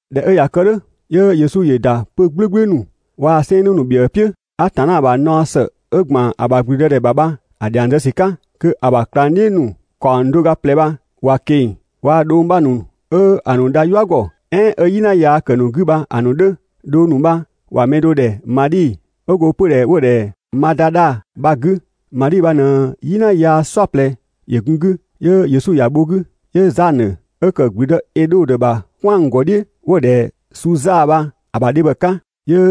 ꞊Dhɛ 'ö ꞊ya kë "dhʋ̈, 'yö Yesu ‑yö ‑da 'pö‑ "gblʋ̈gblʋ̈ ‑nu waa‑ 'sɛɛnnë ‑nu ‑bhiëë "piʋ̈, Atanna ‑bha naɔ ‑së 'ö ‑gban ‑a ‑bha ‑gblüdëdhɛ ‑bha bha‑ dhiang zë ‑sü 'ka. Kö‑ ‑bha ꞊klangdhiʋ̈ ‑nu ‑kaɔng do ga ꞊plɛ bha ‑wa ꞊keng‑ waa‑ dhong ‑nu 'bha ‑nu 'ö‑ ‑nu dha "yua ‑gɔ, "ɛɛn 'ö "yina yaa ‑kë ‑nu 'gü bha‑ ‑nu 'dhö. Dhong ‑nu bha ‑wa mɛ do ‑dhɛ Madhi 'ö go 'pödhɛ 'wo‑ ‑dhɛ Madadha bha‑ 'gü. Madhi bha ꞊në "yina yaa "saɔplɛ ‑yö gun‑ 'gü, 'yö Yesu ‑ya bho‑ 'gü. 'Yö Zanö, 'ö ‑kë ‑gblüdë Edhodö ‑bha "kwɛangɔdhiʋ̈ 'wo‑ ‑dhɛ Suza bha‑ ‑bha dhebhɔ 'ka, 'yö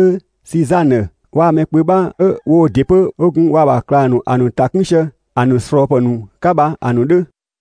Sizanö waa‑ mɛ kpö 'bha 'ö woo ‑dɩ 'pö 'wo gun waa‑ ‑bha ꞊klang ‑nu ‑a ‑nu ‑ta 'kun sië ‑a ‑nu ꞊slɔɔpë ‑nu 'ka bha‑ ‑nu 'dhö.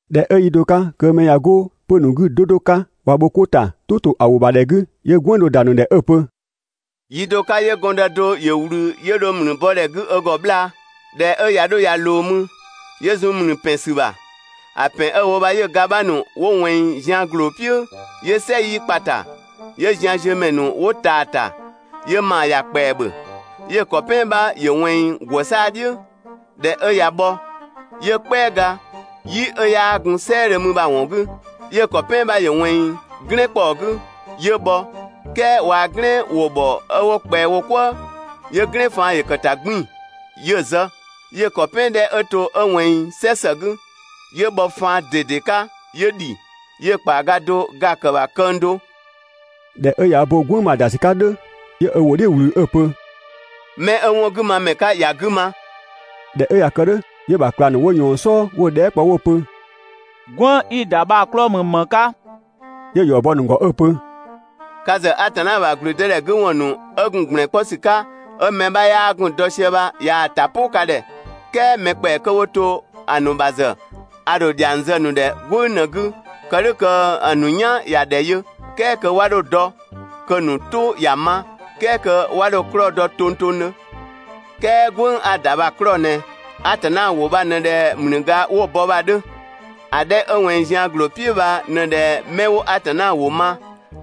꞊Dhɛ 'ö yi do 'ka kö mɛ ꞊ya 'go 'pö‑ ‑nu 'gü 'do 'do 'ka ꞊wa bho wo 'ko ‑ta "tʋ ‑to ‑a ‑wʋ ‑bha ‑dhɛ 'gü, 'yö "gwënng do ‑da ‑nu ‑dhɛ 'ö‑ pö: «Yi do 'ka 'yö gɔndë do ‑yö ꞊wlü 'yö dho ‑mlü bɔ ‑dhɛ 'gü ö ‑gɔ 'bhlaa‑. ꞊Dhɛ 'ö ꞊ya 'dho ꞊ya ꞊loo mü, 'yö zun ‑mlü ‑pɛn ‑sü ‑bha. ‑A ‑pɛn 'ö‑ wo bha 'yö‑ ga 'bha ‑nu 'wo ꞊wɛnng zian ‑gloo "piʋ̈ ('yö "sɛ 'yii kpa‑ ‑ta), 'yö zian ziö ‑mɛ ‑nu 'wo taa‑ ‑ta, 'yö ‑maa ‑ya ‑kpɛa ‑bhö. 'Yö‑ ‑kɔ "pɛan 'bha ‑yö ꞊wɛnng ‑gwë 'saa‑ "dhiʋ̈, ꞊dhɛ 'ö ꞊ya bhɔ 'yö "kpɛaga "yi 'ö 'yaa gun "sɛɛdhö mü bha‑ ‑wɔn 'gü. 'Yö‑ ‑kɔ "pɛan 'bha ‑yö ꞊wɛnng "glɛɛn ‑kpɔɔ 'gü, 'yö bhɔ, "kɛɛ waa‑ "glɛn ‑wo ‑bhɔ 'ö 'wo ꞊kpɛa wo "kwëë, 'yö "glɛn faan ‑yö ‑kë ‑ta 'gbiin‑ 'yö‑ zë. 'Yö‑ ‑kɔ "pɛan 'dhɛ 'ö to 'ö ꞊wɛnng "sɛ ‑së 'gü, 'yö bhɔ faan ꞊dede 'ka 'yö ‑dhi, 'yö‑ ‑kpaaga do ga‑ ‑kë ‑bha këng do.» ꞊Dhɛ 'ö ꞊ya ö bo "gwënng bha‑ ‑da ‑sü 'ka "dhʋ̈, 'yö ö ‑wʋ "dhiʋ̈ ꞊wlü 'ö‑ pö: «'Mɛ 'ö 'wɔn 'gü ma ‑mɛ 'ka ‑ya 'gü ma!» ꞊Dhɛ 'ö ꞊ya kë "dhʋ̈, 'yö‑ ‑bha ꞊klang ‑nu 'wo ꞊yɔɔn‑ "sɔɔ 'wo‑ dhɛɛ" kpɔ 'wo‑ pö: «"Gwënng 'i‑ ‑da bha‑ 'klɔɔ‑ ‑mü ‑më 'ka?» 'Yö‑ ‑yɔ bɔ‑ ‑nu ‑gɔ 'ö‑ pö: «Ka ‑zë Atanna ‑bha ‑gblüdëdhɛ 'gü ‑wɔn ‑nu 'ö gun ‑gblɛn 'kpɔ ‑sü 'ka 'ö mɛ 'bha 'yaa gun‑ dɔ sië bha ꞊yaa‑ ‑ta "pʋ ka ‑dhɛ, "kɛɛ mɛ ‑kpɛa 'kö 'wo to ‑a ‑nu ‑bha ‑zë, a ‑dho ‑dhiang zë‑ ‑nu ‑dhɛ "gwënng ꞊në‑ 'gü, kë "dhʋ̈ kö‑ ‑nu "yan ‑ya ‑dhɛ yö "kɛɛ kö 'wa 'dho‑ dɔ, kö‑ ‑nu "tʋ ‑ya ma, "kɛɛ kö 'wa 'dho‑ 'klɔɔ‑ dɔ tongtongdhö. "Kɛɛ "gwënng 'a‑ ‑da bha‑ 'klɔɔ‑ ꞊nɛ: Atanna ‑wʋ bha ꞊në ꞊dhɛ ‑mlüga 'wo‑ bɔ bha‑ 'dhö. ‑A 'dhɛ 'ö ꞊wɛnng zian ‑gloo "piʋ̈ bha ꞊në ꞊dhɛ 'mɛ 'wo Atanna ‑wʋ ma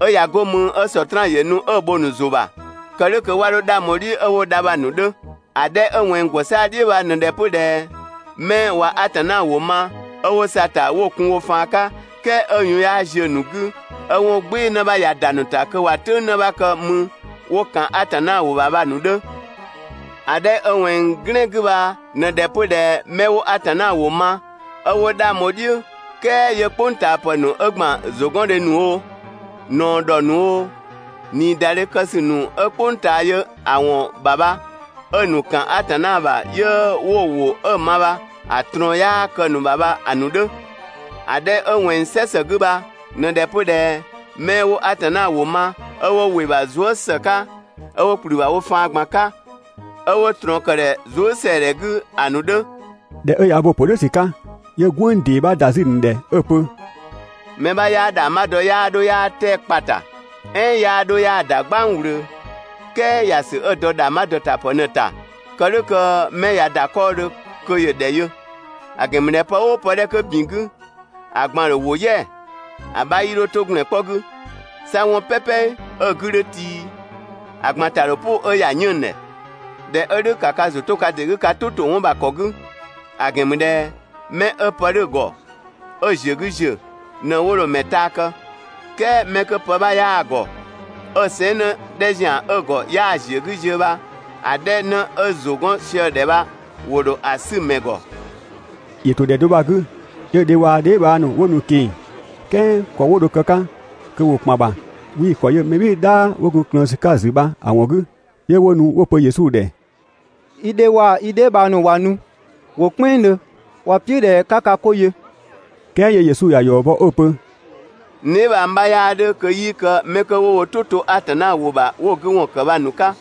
'ö ꞊ya 'go mü 'ö Sɔtraan ‑yö nu 'ö‑ bho‑ ‑nu ‑zʋ ‑bha, kë "dhʋ̈ kö 'wa 'dho 'dhang bho‑ "dhiʋ̈ 'ö 'wo dha bha‑ ‑nu 'dhö. ‑A 'dhɛ 'ö ꞊wɛnng ‑gwë saa‑ "dhiʋ̈ bha ꞊në ꞊dhɛ 'pö ꞊dhɛ 'mɛ ꞊wa Atanna ‑wʋ ma, 'ö 'wo sa‑ ‑ta 'wo‑ kun wo faan 'ka, "kɛɛ 'ö‑ yun 'yaa ziö‑ ‑nu 'gü, 'ö 'wɔn "gbɩɩ‑ 'në 'bha ꞊ya ‑da ‑nu ‑ta kö ꞊wa "tʋ̈ng 'në 'bha kë 'mü 'wo ‑kan Atanna ‑wʋ ‑bha bha‑ ‑nu 'dhö. ‑A 'dhɛ 'ö ꞊wɛnng "glɛn 'gü bha ꞊në ꞊dhɛ 'pö ꞊dhɛ 'mɛ 'wo Atanna ‑wʋ ma, 'ö 'wo 'dhang bho‑ "dhiʋ̈, "kɛɛ 'yö "kpʋngtaapë ‑nu 'ö ‑gban ‑zʋgɔndhe ‑nu oo, ꞊naɔ ‑dhɔ ‑nu oo, ꞊niidadhe kë ‑sü ‑nu 'ö "kpʋng ꞊taa yö ‑a ‑wɔn ‑bha bha 'ö‑ ‑nu ‑kan Atanna ‑bha 'yö 'wo‑ ‑wʋ 'ö‑ ma bha‑ ꞊trɔɔn 'yaa kë‑ ‑nu ‑bha bha‑ ‑nu 'dhö. ‑A 'dhɛ 'ö ꞊wɛnng "sɛ ‑së 'gü bha ꞊në ꞊dhɛ 'pö ꞊dhɛ 'mɛ 'wo Atanna ‑wʋ ma, 'ö 'wo ‑wɩ ‑bha zuë" ‑së 'ka 'ö 'wo ‑kplü ‑bha wo faan ꞊gban 'ka, 'ö 'wo ꞊trɔɔn ‑kë ‑dhɛ zuësɛadhɛ 'gü ‑a ‑nu 'dhö. ꞊Dhɛ 'ö ꞊ya ö bo‑ ‑pö "dhʋ̈ ‑sü 'ka, 'yö "gwënng ‑dee 'bha ‑da 'zü‑ ‑nu ‑dhɛ 'ö‑ pö: «Mɛ 'bha 'yaa ‑dhangbha dɔ 'yaa 'dho 'yaa 'tɛa‑ kpa‑ ‑ta, "ɛɛn 'yaa dho 'yaa‑ ‑da "gbang ꞊wlöö, "kɛɛ ‑ya ‑sü 'ö‑ dɔ ‑dhangbha ‑dɔtapë ꞊në‑ ‑ta kë "dhʋ̈ kö mɛ ꞊ya ‑da 'kɔɔdhö kö ‑yö ‑dhɛ yö. ‑A ‑gɛn ‑mü ꞊dhɛ pë "ʋʋ pë 'dhɛ 'kö ‑bin 'gü, ‑a ꞊gban‑ ‑dho ‑wo "yɛa‑, ‑a 'bha 'yii 'dho 'to ‑gblɛn 'kpɔ 'gü, 'sa 'wɔn "pɛpɛ 'ö‑ 'gü 'dhö tii, ‑a ꞊gban ‑ta ‑dho "pʋ 'ö ‑ya 'yënng‑ ‑dhɛ. ꞊Dhɛ 'ö "dhʋ̈, ‑ka ka ‑zʋ 'to ka ‑dɩ 'gü ka "tʋ ‑to 'wɔn ‑bha ‑kɔ 'gü; ‑a ‑gɛn ‑mü ꞊dhɛ 'mɛ 'ö pë 'dhö‑ ‑gɔ 'ö‑ ‑ziö 'gü ‑ziö ꞊në 'wo dho‑ ‑mɛ taa kë, "kɛɛ 'mɛ 'kö pë 'bha 'yaa‑ ‑gɔ, 'ö‑ sɛɛn" 'në 'dhɛ ‑zian 'ö‑ ‑gɔ 'yaa‑ ‑ziö 'gü ziö bha, ‑a 'dhɛ 'në ö ‑zʋ 'gɔn sië‑ ‑dhɛ bha, ‑wo ‑dho ‑a 'sü‑ ‑mɛ ‑gɔ. ‑Yö ‑to ‑dhɛ bha‑ 'gü 'yö‑ dhe waa‑ dheebhang ‑nu 'wo nu‑ ꞊keng‑. "Kɛɛ ‑kɔ 'wo dho‑ kë‑ 'ka kö ‑wo ‑kpan ‑bha, 'wii‑ ‑kɔ yö mɛ "bhɩɩ‑ "dhaa 'wo gun‑ ꞊klëën ‑sü 'ka‑ ‑zü bha‑ ‑wɔn 'gü. 'Yö 'wo nu 'wo‑ pö Yesu ‑dhɛ: «I dhe waa‑ i dheebhang ‑nu ꞊wa nu, ‑wo "kpɛnngdhö, ‑wa "piʋ̈ ꞊dhɛ 'ka ka 'ko yö.» "Kɛɛ 'yö Yesu ‑ya ‑yɔ bɔ 'ö‑ pö: «N dheebhang 'bha 'yaa 'dhö kö 'yii kë 'mɛ 'kö 'wo wo "tʋ 'to Atanna ‑wʋ ‑bha 'wo‑ 'gü ‑wɔn ‑kë bha‑ ‑nu 'ka.»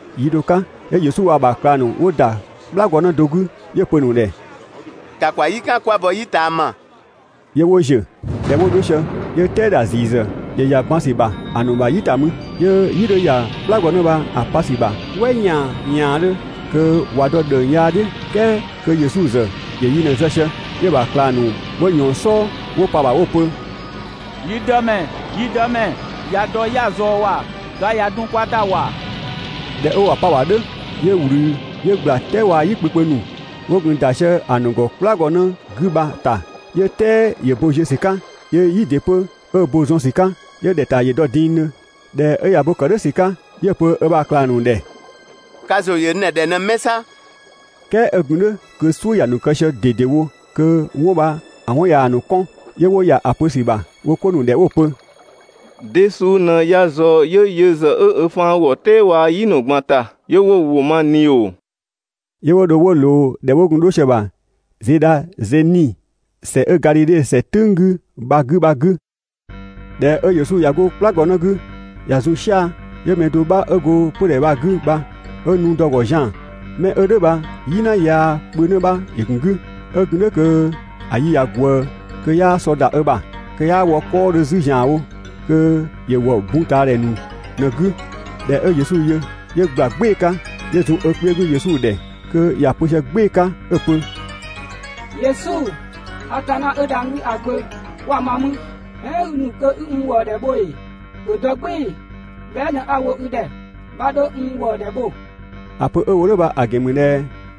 Yi do 'ka 'yö Yesu waa‑ ‑bha ꞊klang ‑nu 'wo ‑da "kplagɔnë do 'gü, 'yö‑ pö‑ ‑nu ‑dhɛ: «‑Ka ‑kwa "yi "kan 'kwa bɔ "yi ꞊taama!» 'Yö 'wo ‑ziö. ꞊Dhɛ 'wo 'dho sië, 'yö "tɛɛ ‑dha ‑ziisü ‑yö ‑ya ban ‑sü ‑bha ‑a ‑nu ‑bha "yi ‑ta mü, 'yö "yi 'dhö ‑ya "kplagɔnë bha‑ pa ‑sü ‑bha "wɛ ‑yaan ‑yaandhö, kö ꞊wa dɔ ‑dhëng yaa "dhiʋ̈, "kɛɛ 'kö Yesu ‑zë ‑yö yi ꞊në‑ zë sië. 'Yö‑ ‑bha ꞊klang ‑nu 'wo ꞊yɔɔn‑ "sɔɔ 'wo pa‑ ‑bha 'wo‑ pö: «Yi Dëmɛ, yi Dëmɛ, ꞊ya dɔ 'ya‑ ꞊zɔɔ ‑wa, ga ꞊ya dun kwa ‑ta ‑wa!» ꞊Dhɛ 'ö ꞊wa 'pa‑ ‑bha "dhʋ̈, 'yö ꞊wlü 'yö ꞊gbla "tɛɛ waa‑ "yi kpö kpö ‑nu 'wo gun ‑da sië‑ ‑nu ‑gɔ "kplagɔnë 'gü bha‑ ‑ta, 'yö "tɛɛ ‑yö bo ziö ‑sü 'ka, 'yö "yi ‑dɩ 'pö 'ö bo zɔn ‑sü 'ka, 'yö ‑dhɛ ‑ta ‑yö dɔ dingdhö. ꞊Dhɛ 'ö ꞊ya bo ‑kë "dhʋ̈ ‑sü 'ka, 'yö‑ pö ö ‑bha ꞊klang ‑nu ‑dhɛ: «Ka ‑zʋ ‑yö n ‑dhɛ ‑dhɛ ꞊në 'mɛ 'sa?» "Kɛɛ 'ö gun "dhʋ̈ kö "suʋ̈ ‑ya ‑nu kë sië ꞊dedewo kö 'wɔn bha‑ 'wɔn ꞊yaa‑ ‑nu 'kɔn, 'yö 'wo ‑ya ‑a pö ‑sü ‑bha wo 'ko ‑nu ‑dhɛ 'wo‑ pö: «De suu ꞊në ya ꞊zɔɔ 'yö yö ‑zë 'ö ö faan ‑wɔ "tɛɛ waa‑ "yi ‑nu ꞊gban ‑ta 'yö 'wo‑ ‑wʋ ma ꞊ni ‑oo?» 'Yö 'wo dho 'wo ꞊loo ‑dhɛ 'wo gun dho sië‑ ‑bha Zedhazeni ‑sɛ 'ö Gadhidhe ‑sɛ "tʋ̈ng 'gü bha‑ 'gü bha‑ 'gü. ꞊Dhɛ 'ö Yesu ꞊ya 'go "kplagɔnë 'gü ꞊ya zun "sia‑, 'yö mɛ do 'bha 'ö go 'pödhɛ bha‑ 'gü bha 'ö nu dɔ‑ ‑gɔ zian‑. Mɛ 'ö "dhʋ̈ bha "yina yaa kpö 'në 'bha ‑yö ‑gun 'gü. 'Ö gun "dhʋ̈ kö‑ yi ꞊ya ꞊gwëë kö 'yaa sɔ ‑da ö ‑bha, kö 'yaa wɔ 'kɔɔdhö 'zü ‑zianwo, kö ‑yö ‑wɔ bun ꞊taa ‑dhɛ ‑nu ꞊në‑ 'gü. ꞊Dhɛ 'ö Yesu yö, 'yö ꞊gbla "gbɩɩ‑ 'ka, 'yö zun ö kpiö 'gü Yesu ‑dhɛ kö ‑ya pö sië "gbɩɩ‑ 'ka 'ö‑ pö: «Yesu, Atanna 'ö dhang‑ 'gü ‑a gbö, 'kwa ma mü? "Ɛɛn i ‑nu kö 'i n ‑wëëdhɛ bho ‑ee? ‑Bhö dɔ "gbɩɩ‑ bhɛa" ꞊në 'a‑ wo i ‑dhɛ, 'bha 'dho n ‑wëëdhɛ bho!» ‑A pö 'ö‑ wo "dhʋ̈ bha‑ ‑gɛn ‑mü ꞊dhɛ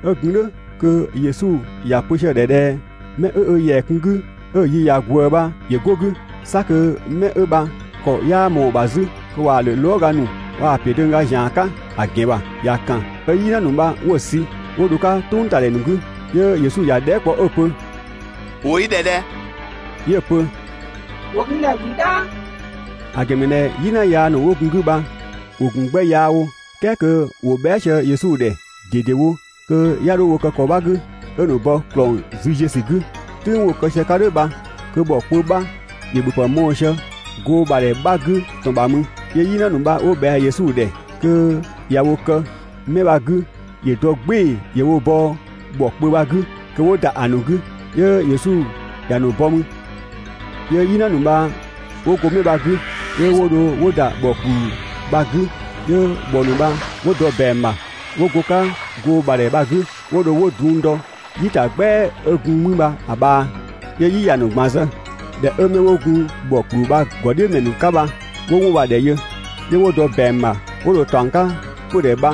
'ö gun "dhʋ̈ kö Yesu ‑ya pö sië‑ ‑dhɛ ꞊dhɛ 'mɛ 'ö ö ‑yɛa kun‑ 'gü 'ö‑ yi ꞊ya ꞊gwëë bha ‑yö 'go‑ 'gü. 'Sa kö 'mɛ 'ö bha ‑kɔ 'yaa ꞊mɔɔ‑ ‑bha 'zü, kö ꞊waa‑ ‑lö lɔɔga ‑nu waa‑ ‑piö döngga ‑zian 'ka ‑a ‑gɛn ‑bha, ‑ya ‑kan 'ö "yina ‑nu bha 'wo‑ sü 'wo dho‑ 'ka "tʋngtadhɛ ‑nu 'gü. 'Yö Yesu ‑ya dhɛɛ" kpɔ 'ö‑ pö: «‑Wo i ‑dhɛ ꞊dhɛ?» 'Yö‑ pö: «‑Wo n ‑dhɛ ‹‑gblü "dhaa›»; ‑a ‑gɛn ‑mü ꞊dhɛ "yina ‑nu 'wo gun‑ 'gü bha ‑wo ‑gun 'gbɛ yaa wo. "Kɛɛ kö ‑wo bhɛa" sië Yesu ‑dhɛ ꞊dedewo kö 'ya 'dho wo kë 'mɛ bha‑ 'gü 'ö‑ ‑nu bɔ ‑klɔng züziösü 'gü. "Tʋ̈ng 'wo‑ kë sië‑ 'ka "dhʋ̈ bha kö ‑bhɔ kpö 'bha ‑yö ‑bhöpë mɔɔ‑ sië goo ‑bha ‑dhɛ 'bha 'gü ‑tɔn ‑bha mü. 'Yö "yina ‑nu bha 'wo ꞊bhɛa Yesu ‑dhɛ kö ꞊ya wo kë 'mɛ bha‑ 'gü ‑yö dɔ "gbɩɩ‑ ‑yö wo bɔ ‑bhɔ kpö bha‑ 'gü kö 'wo ‑da ‑a ‑nu 'gü. 'Yö Yesu ‑ya ‑nu bɔ mü. 'Yö "yina ‑nu bha 'wo go 'mɛ bha‑ 'gü, 'yö 'wo dho 'wo ‑da ‑bhɔ ‑kpluu bha‑ 'gü, 'yö ‑bhɔ ‑nu bha 'wo dɔ ‑bɛang ‑bha 'wo go‑ 'ka goo ‑bha ‑dhɛ bha‑ 'gü, 'yö 'wo dho 'wo drung dɔ "yi ‑ta "gbɛa 'ö gun mü bha‑ ꞊bhaa, 'yö "yi ‑ya ‑nu ꞊gban zë. ꞊Dhɛ 'ö 'mɛ 'wo gun ‑bhɔ ‑kpluu bha‑ ‑gɔdhiʋ̈mɛ ‑nu 'ka bha 'wo 'wɔn bha‑ ‑dhɛ yö, 'yö 'wo dɔ ‑bɛang ‑bha 'wo dho‑ ‑taɔng 'ka 'pödhɛ bha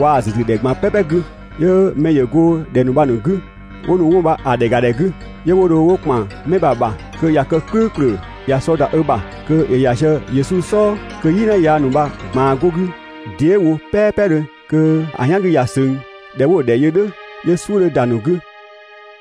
waa‑ ‑züzüdhɛ ꞊gban "pɛpɛ 'gü. 'Yö mɛ ‑yö go ‑dhɛ ‑nu bha‑ 'gü 'wo nu 'wɔn bha‑ ‑dhɛ ‑ga ‑dhɛ 'gü. 'Yö 'wo dho 'wo ‑kpan 'mɛ bha‑ ‑bha kö ꞊ya kë "klʋ̈ʋ̈klʋ̈ ꞊ya sɔ ‑da ö ‑bha kö ‑yö ‑ya sië Yesu "sɔɔ, kö "yina yaa bha‑ ꞊gbaan 'go‑ 'gü dee" wo "pɛpɛdhö kö‑ "yan 'gü ꞊ya ꞊söng. ꞊Dhɛ 'wo‑ ‑dhɛ yö "dhʋ̈, 'yö "suʋ̈ 'dhö ‑da ‑a ‑nu 'gü.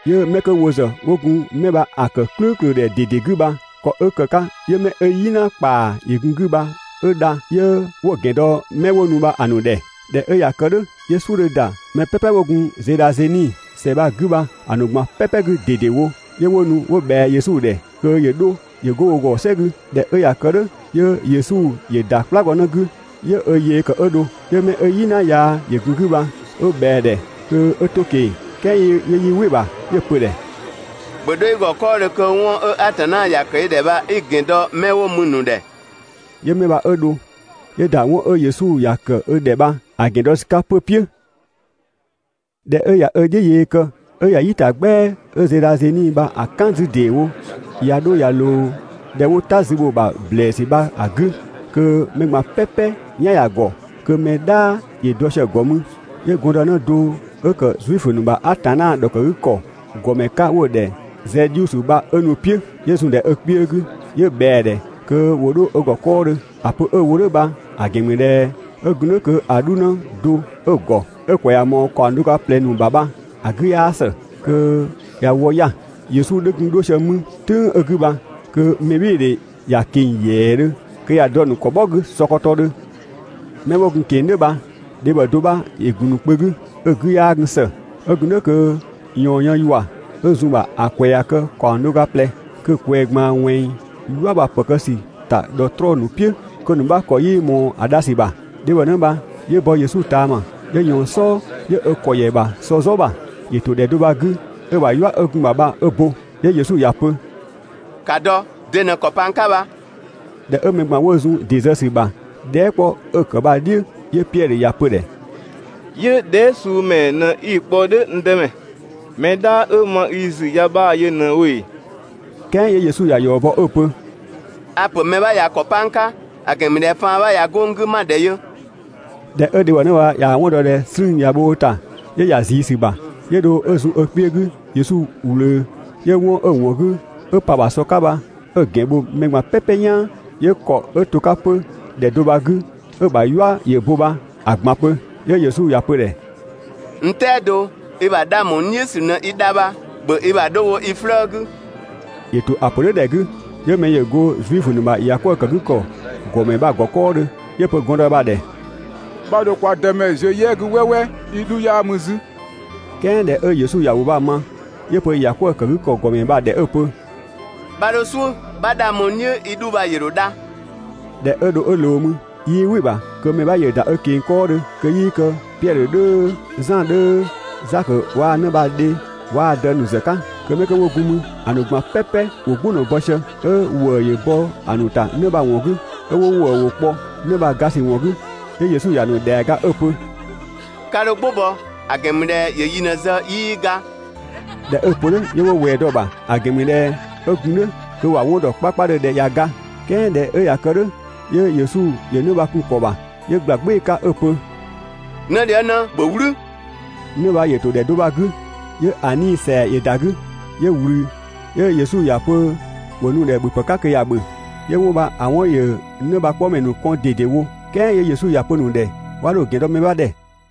'Yö 'mɛ 'kö wo ‑zë 'wo gun 'mɛ bha‑ ‑kë "klʋ̈ʋ̈klʋ̈ ‑dhɛ ꞊dede 'gü bha, ‑kɔ 'ö ‑kë 'ka 'yö 'mɛ 'ö "yina ‑kpaa ‑yö gun‑ 'gü bha 'ö dha, 'yö 'wo‑ ‑gɛn dɔ 'mɛ 'wo nu bha‑ ‑nu ‑dhɛ. ꞊Dhɛ 'ö ꞊ya kë "dhʋ̈, 'yö "suʋ̈ 'dhö ‑da mɛ "pɛpɛ 'wo gun Zenezadhe ‑sɛ bha‑ 'gü bha‑ ‑nu ꞊gban "pɛpɛ 'gü ꞊dedewo, 'yö 'wo nu 'wo ꞊bhɛa Yesu ‑dhɛ kö ‑yö 'dho ‑yö 'go wo ‑gɔ "sɛ 'gü. ꞊Dhɛ 'ö ꞊ya kë "dhʋ̈, 'yö Yesu ‑yö ‑da "kplagɔnë 'gü 'yö ö yee ‑kë 'ö dho. 'Yö 'mɛ 'ö "yina yaa ‑yö gun‑ 'gü bha 'ö ꞊bhɛa‑ ‑dhɛ kö 'ö 'to‑ ꞊keng‑. "Kɛɛ 'yö 'yii "wɩ‑ ‑bha, 'yö‑ pö‑ ‑dhɛ: «‑Bhö 'dho i ‑gɔ 'kɔɔdhö kö 'wɔn 'ö Atanna ‑ya ‑kë i ‑dhɛ bha 'i‑ ‑gɛn dɔ 'mɛ 'wo mü‑ ‑nu ‑dhɛ. 'Yö 'mɛ bha 'ö dho 'yö ‑da 'wɔn 'ö Yesu ‑ya ‑kë ö ‑dhɛ bha‑ ‑gɛn dɔ ‑sü 'ka 'pö‑ "piʋ̈. ꞊Dhɛ 'ö ꞊ya ö "dhiʋ̈ yee kë 'ö ꞊ya "yi ‑ta "gbɛa 'ö Zenezadhe bha‑ "kan 'zü ‑deewo, ꞊ya 'dho ꞊ya ꞊loo ‑dhɛ 'wo "ta zü bho‑ ‑bha ‑blɛɛsü bha‑ 'gü kö mɛ ꞊gban "pɛpɛ "yan ‑ya ‑gɔ, kö mɛ "dhaa ‑yö dɔ sië‑ ‑gɔ mü, 'yö gɔndënë do 'ö ‑kë Zuifö ‑nu ‑bha Atanna ‑dhɔkëgükɔ ‑gɔmɛ 'ka 'wo‑ ‑dhɛ Zɛdhiusö bha 'ö nu‑ "piʋ̈, 'yö zun‑ ‑dhɛ ö kpiö 'gü, 'yö ꞊bhɛa‑ ‑dhɛ kö 'wo 'dho ö ‑gɔ 'kɔɔdhö. ‑A pö 'ö‑ wo "dhʋ̈ bha‑ ‑gɛn ‑mü ꞊dhɛ 'ö gun "dhʋ̈ kö‑ 'dhunë do 'ö‑ ‑gɔ, 'ö‑ ‑kwɛ ꞊ya ꞊mɔɔ ‑kaɔng do ga ꞊plɛ ‑nu ‑bha bha‑ 'gü 'yaa ‑së, kö ꞊ya wɔ 'ya‑. Yesu 'dhö gun 'dho sië mü "tʋ̈ng 'ö‑ 'gü bha, kö mɛbhɩɩdhe ‑ya ꞊keng‑ ‑yɛɛdhö, kö ꞊ya dɔ‑ ‑nu ‑kɔ "bhɔ 'gü sɔkɔtɔdhö. 'Mɛ 'wo gun‑ ꞊keng‑ "dhʋ̈ bha, dhebhɔnë do 'bha ‑yö ‑gun ‑nu kpö 'gü, 'ö‑ 'gü 'yaa gun ‑së. 'Ö gun "dhʋ̈ kö ꞊yɔɔn yën ‑yua 'ö zun‑ ‑bha ‑a ‑kwɛ ꞊ya kë ‑kaɔng do ga ꞊plɛ. Kö‑ ꞊kwɛɛ ꞊gbaan ꞊wɛnng "yua bha‑ ‑pë kë ‑sü ‑ta ‑dhɔtrɔɔ ‑nu "piʋ̈, kö‑ ‑nu 'bha ‑kɔ 'yii ꞊mɔɔ‑ dha ‑sü ‑bha. Dhebhɔ bha 'yö bɔ Yesu ꞊taama, 'yö ꞊yɔɔn‑ "sɔɔ, 'yö ö ‑kɔ ‑yɛ ‑bha sɔ "zɔ ‑bha. ‑Yö ‑to ‑dhɛ do bha‑ 'gü, 'ö‑ ‑bha "yua 'ö gun‑ ‑bha bha 'ö bo. 'Yö Yesu ‑ya pö: «‑Ka dɔ! De ꞊në‑ ‑kɔ pa n 'ka bha?» ꞊Dhɛ 'ö mɛ ꞊gban 'wo zun ‑dɩ ‑zë ‑sü ‑bha dhɛɛ" 'kpɔ 'ö‑ ‑kë bha‑ "dhiʋ̈, 'yö Piɛdhö ‑ya pö‑ ‑dhɛ: «'Yö dhɛɛ" suu ‑mɛɛ ꞊në 'i‑ kpɔ "dhʋ̈, n Dëmɛ? Mɛ "dhaa 'ö ma i ‑zü ya 'bhaa‑ yö ꞊në wo ‑ee?» "Kɛɛ 'yö Yesu ‑ya ‑yɔ bɔ 'ö‑ pö: «A‑ ‑pö mɛ 'bha ꞊ya ‑kɔ 'pa n 'ka! ‑A ‑gɛn ‑mü ꞊dhɛ faan 'bha ꞊ya 'go n 'gü, 'ma‑ ‑dhɛ yö.» ꞊Dhɛ 'ö dhebhɔnë bha ꞊yaa‑ 'wɔn dɔ ꞊dhɛ 'slüü‑ ꞊ya bho ö ‑ta, 'yö ‑ya ꞊zii ‑sü ‑bha, 'yö dho 'ö zun ö kpiö 'gü Yesu ꞊wlöö, 'yö 'wɔn 'ö‑ ‑wɔn 'gü, 'ö pa‑ ‑bha sɔ 'ka bha 'ö‑ ‑gɛn bho mɛ ꞊gban "pɛpɛ "yaan, 'yö ‑kɔ 'ö to‑ 'ka 'pö ‑dhɛ do bha‑ 'gü, 'ö‑ ‑bha "yua ‑yö bo bha 'ö‑ ꞊gban pö. 'Yö Yesu ‑ya pö‑ ‑dhɛ: «N "tɛado, i ‑bha 'dhang ‑bho n "dhiʋ̈ ‑sü ꞊në i dha bha, ‑bhö i ‑bha 'dho wo i 'flëë‑ 'gü!» ‑Yö ‑to ‑a pö "dhʋ̈ ‑dhɛ 'gü, 'yö mɛ ‑yö go Zuifö ‑nu ‑bha ‑yakwëëkëgükɔ ‑gɔmɛ bha‑ ‑gɔ 'kɔɔdhö, 'yö‑ pö gɔndë bha‑ ‑dhɛ: «'Bha 'dho kwa Dëmɛ ziö "yɛ 'gü "wɛɛwɛɛ, i 'dhu 'yaa mü 'zü.» "Kɛɛ ꞊dhɛ 'ö Yesu ‑yö ‑wʋ bha‑ ma, 'yö‑ pö ‑yakwëëkëgükɔ ‑gɔmɛ bha‑ ‑dhɛ 'ö‑ pö: «'Bha 'dho "suʋ̈, 'bha 'dhang bho n "dhiʋ̈, i 'dhu bha ‑yö ‑dho dha.» ꞊Dhɛ 'ö dho 'ö ꞊loo mü, 'yii "wɩ‑ ‑bha kö mɛ 'bha ‑yö ‑da ö ꞊keng‑ 'kɔɔdhö kö 'yii kë Piɛdhö 'dhöö, Zan 'dhöö, Zakö waa‑ 'në bha‑ dhe waa‑ dë ‑nu ‑zë 'ka. Kö 'mɛ 'kö 'wo gun mü, ‑a ‑nu ꞊gban "pɛpɛ ‑wo "gbʋ ꞊në‑ bɔ sië, 'ö 'wo ‑wëë ‑wʋ kpɔ 'në bha‑ ga ‑sü ‑wɔn 'gü. 'Yö Yesu ‑ya ‑nu ‑dhɛa ‑ga 'ö‑ pö: «'Ka 'dho "gbʋ bɔ, ‑a ‑gɛn ‑mü ꞊dhɛ ‑yö yi ꞊në‑ ‑zë 'yii ga.» ꞊Dhɛ 'ö‑ pö "dhʋ̈, 'yö 'wo ꞊wɛɛ dɔ‑ ‑bha, ‑a ‑gɛn ‑mü ꞊dhɛ 'ö gun "dhʋ̈ kö ‑wa 'wɔn ‑dɔ 'kpakpadhö ꞊dhɛ ꞊ya ga. "Kɛɛ ꞊dhɛ 'ö ꞊ya kë "dhʋ̈, 'yö Yesu ‑yö 'në bha‑ kun‑ ‑kɔ ‑bha, 'yö ꞊gbla "gbɩɩ‑ 'ka 'ö‑ pö: «'Nëdhiëngnë, ‑bhö "wlü!» 'Në bha ‑yö ‑to ‑dhɛ do bha‑ 'gü 'yö‑ 'nii‑ ‑sɛa ‑yö ‑da 'gü, 'yö ꞊wlü, 'yö Yesu ‑ya pö ‑wo nu‑ ‑dhɛ ‑bhöpë 'ka kö ‑ya ‑bhö. 'Yö 'wɔn bha‑ 'wɔn ‑yö 'në bha‑ 'kpɔmɛ ‑nu kɔn ꞊dedewo, "kɛɛ 'yö Yesu ‑ya pö‑ ‑nu ‑dhɛ 'wa 'dho‑ ‑gɛn dɔ mɛ 'bha ‑dhɛ.